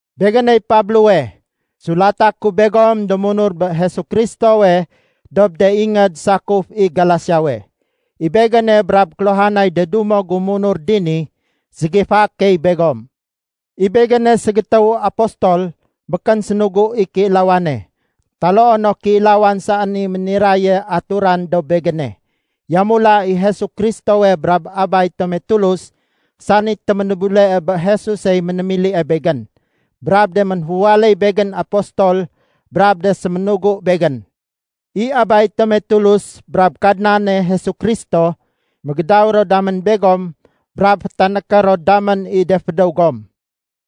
Begéney Pablowe, sulata ku begom do munur bé Jesu Kristowe dob de ingéd sakuf i Galasiawe. I begéne brab kéluhanay de dumo gu munur dini, ségifaé key begom. I begéne ségétéwu apostol békén sénugu i kéilawane, taloo no kéilawan saén i méniraye aturan dob begéne. Yamula i Jesu Kristowe brab Abay tome Tulus sani téménébulee bé Jesusey ménémilie begén, brab de ménféwaléy begén apostol brab de séménugu begén. I Abay tome Tulus brab Kadnane Jesu Kristo, mégédaw ro damén begom brab fétanéké ro damén i de fédéw gom.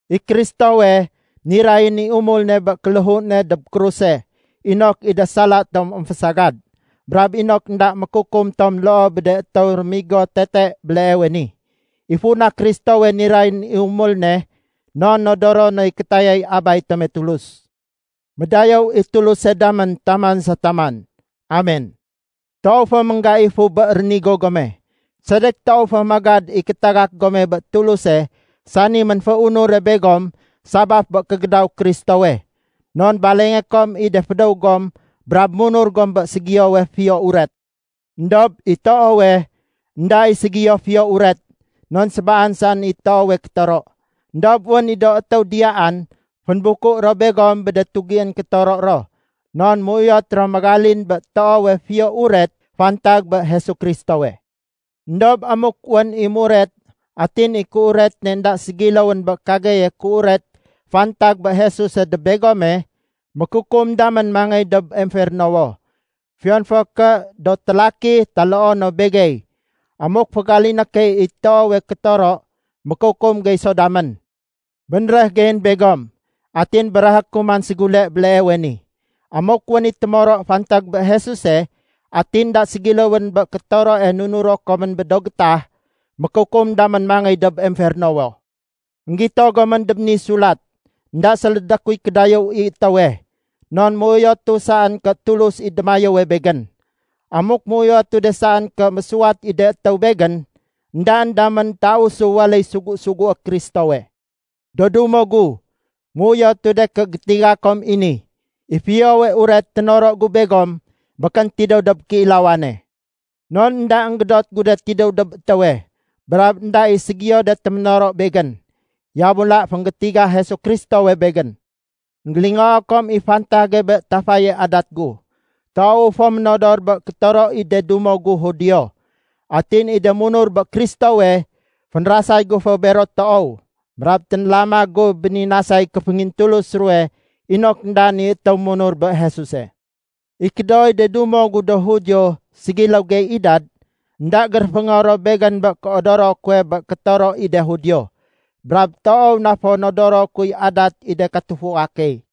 I Kristowe, nirayén i umul ne bé kéléhu ne dob kruse inok i de sala tom émfésagad, brab inok énda mékukum tom loo bé de étéw rémigo tete béleewe ni. I funa Kristowe nirayén i umul ne, non nodoro noy kétayay Abay tome Tulus. Médayéw i Tuluse damén taman sa taman! Amen. Toow fo ménggaifu bé rénigo gome. Sedek toow fo magad i kétagak gome bé Tuluse sani ménféunure begom sabaf bé kégédaw Kristowe. Non balengé kom i de fédéw gom brab munur gom bé ségiyowe “Fiyo Uret”. Endob i toowe, énda i ségiyo Fiyo Uret non sébaan saén i toowe kétoro. Endob wén i do étéw diyaan fénbuku ro begom bé de tugién kétoro ro non méuyot ro mégalin bé toowe Fiyo Uret fantag bé Jesu Kristowe. Endob amuk wén i muret atin i kéuret ne énda ségiléwén bé kageye kéuret fantag bé Jesuse dob begome, mékukum damén mangéy dob emfernowo. Fiyon fo ké do télaki taloo no begey, amuk fégaliné key i toowe kétoro, mékukum gey so damén! Bénréh geyén begom atin béréhé ku man ségule béleewe ni. Amuk wén i témoro fantag bé Jesuse atin énda ségiléwén bé kétoroe nunuro komén bé do gétah, mékukum damén mangéy dob emfernowo! Enggito gomén dob ni sulat énda sélédé kuy kédayéw i étéwe. Non méuyotu saén ké Tulus i démayéwe begén. Amuk méuyotu de saén ké mésuwat i de étéw begén, éndaén damén tausu waléy sugu-sugué Kristowe. Do dumo gu, méuyotu de ké gétiga kom i ni, i Fiyowe Uret ténoro gu begom békén tidéw dob kéilawane. Non énda énggédot gu de tidéw dob étéwe, brab énda i ségiyo de téménoro begén. Yamula fénggétiga Jesu Kristowe begén. Enggélingoo kom i fantage bé tafaye adat gu. Toowu fo ménodor bé kétoro i de dumo gu Judio. Atin i de munur bé Kristowe, fénrasay gu fo bero toow brab ténlama gu béninasay kéféngintulus ruwe inok éndaén i étéw munur bé Jesuse. I kédooy de dumo gu do Judio ségiléw gey idad, énda géréféngo ro begén bé kéodoro kuwe bé kétoro i de Judio. Brab toow na fo nodoro kuy adat i de katufua key.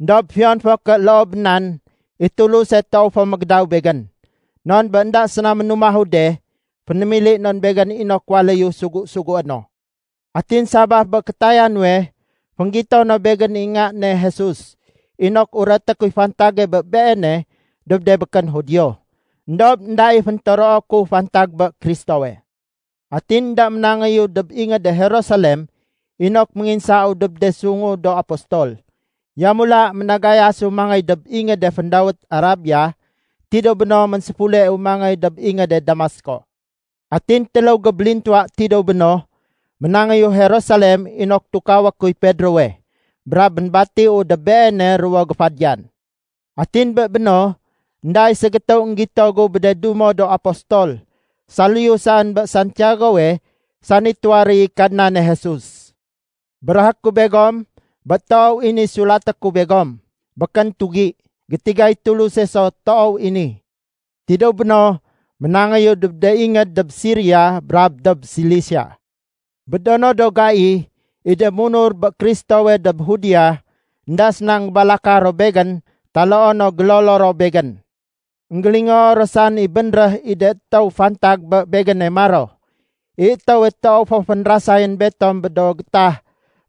Endob fiyon fo ké loo bé nan, i Tuluse toow fo mégédaw begén. Non bé énda séna ménumahu de, fénémili non begén inok waléyu sugu-sugué no. Atin sabaf bé kétaya nuwe, fénggito no begén i Nga ne Jesus inok ureté kuy fantage bé Beene dob de békén Judio. Endob énda i féntoroo ku fantag bé Kristowe. Atin énda ménangéyu dob ingéde Jerusalem inok ménginsau dob de sungu do apostol. Yamula ménagayasu mangéy dob ingéde féndawét Arabia. Tidéw béno, ménséfuleu mangéy dob ingéde Damasko. Atin téléw gébélintuwa tidéw béno, ménangéyu Jerusalem inok tukawé kuy Pedrowe. Brab ménbatiu dob beene ruwo géfadiyan. Atin bé béno, énda i ségétéw énggito gu bé de dumo do apostol saliyu saén bé Santiagowe sani tuwaréy i Kadnane Jesus. Béréhé ku begom bé toow i ni sulaté ku begom, békén tugi. Gétigay Tuluse so toow i ni. Tidéw béno, ménangéyu dob de ingéd dob Siria brab dob Silisia. Bé do no do gai, i de munur bé Kristowe dob Judea, énda séna énggébalaka ro begén taloo no gélolo ro begén. Enggélingoo ro saén i bénréh i de étéw fantag bé begéne maro, “I étéwe toow fo fénrasayén betom bé do gétah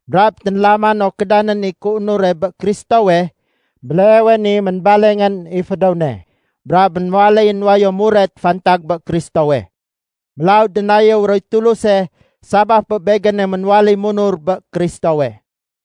brab ténlama no kédanén i kéunure bé Kristowe, béleewe ni ménbalengén i fédéw ne brab ménwaléyén wayo muret fantag bé Kristowe.” Mélaw dénayéw roy Tuluse sabaf bé begéne ménwaléy munur bé Kristowe.